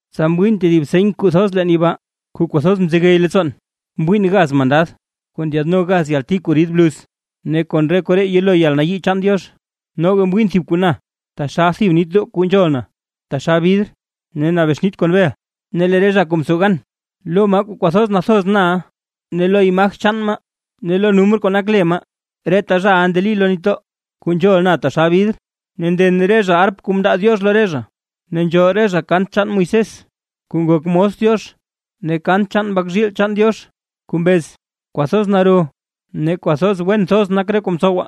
Tsa mwiin tedib seny thoz leen yibaa, kuu kwathoz mzegey leettsoon: Mwiin gaz mandad kuu ndyaadno gaz yalti kuu rid bluz, ne kon re koree yelo yalnayii chaan Diox. Noga mwiin thib kuu na taxal thib nitdoo kuu nzhol na taxal bidr ne nabexnite kon bel; ne lee re zha kuu mtsow gan lo maa kwathoz nathoz na ne lo imaj chaan maa, ne lo numr kuu nak le maa, reta zhaʼa ndeli lo nitdoo kuu nzhol na taxal bidr, ne nden re zha arp kuu mndaa Diox lo re zha. Ne nzhool re zha kant chaan Moisés kuu ngok mos Diox, ne kant chaan Mbak zhiil chaan Diox, kuu mbez: Kwathoz naro ne kwathoz wen thoz nak re kuu mtsowa,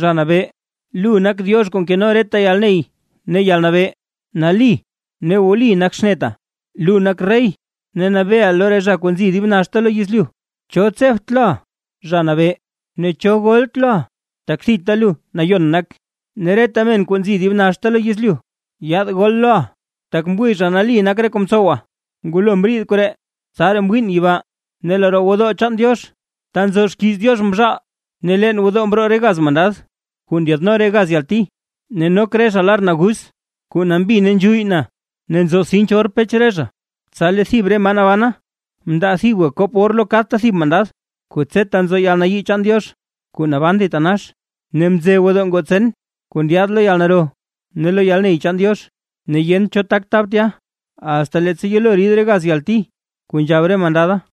Zha Nabee, lu nak Diox kuu nkeno reta yalney ne yalnabee; ¡Nali ne wli nak xneta: Lu nak rey ne nabeeʼa lo re zha kuu nzo dib naxta lo yezlyu! ¿Cho tsebt loʼa, Zha Nabee? Ne ¿cho golt loʼa? Tak thita lu nayon nak, ne reta men kuu nzi dib naxta lo yezlyu, yaad gol loʼa, tak mwii zha nali nak re kuu mtsowa. Ngulo mriid koree, tsaraa mwiin yibaa ne lee roo gwodoo chaan Diox ta nzo xkiiz Diox mzhaal. Ne leen gwodoo mroo re gaz mandad kuu ndyaadno re gaz yalti. Ne nok re zha lar naguz kuu nambi ne nzhuyy na, ne nzo sinch or pech zha. Tsa lee thib re maa nabana, mndaa thibga kop or lo kadta thib mandad, kuu tseta nzo yalnayii chaan Diox kuu naban thitanax. Ne mze gwodoo ngoo tsen kuu ndyaad lo yalnaro ne lo yalney chaan Diox, ne yent cho tak tab tya, asta leettsa yelo rid re gaz yalti kuu nzhab re mandada.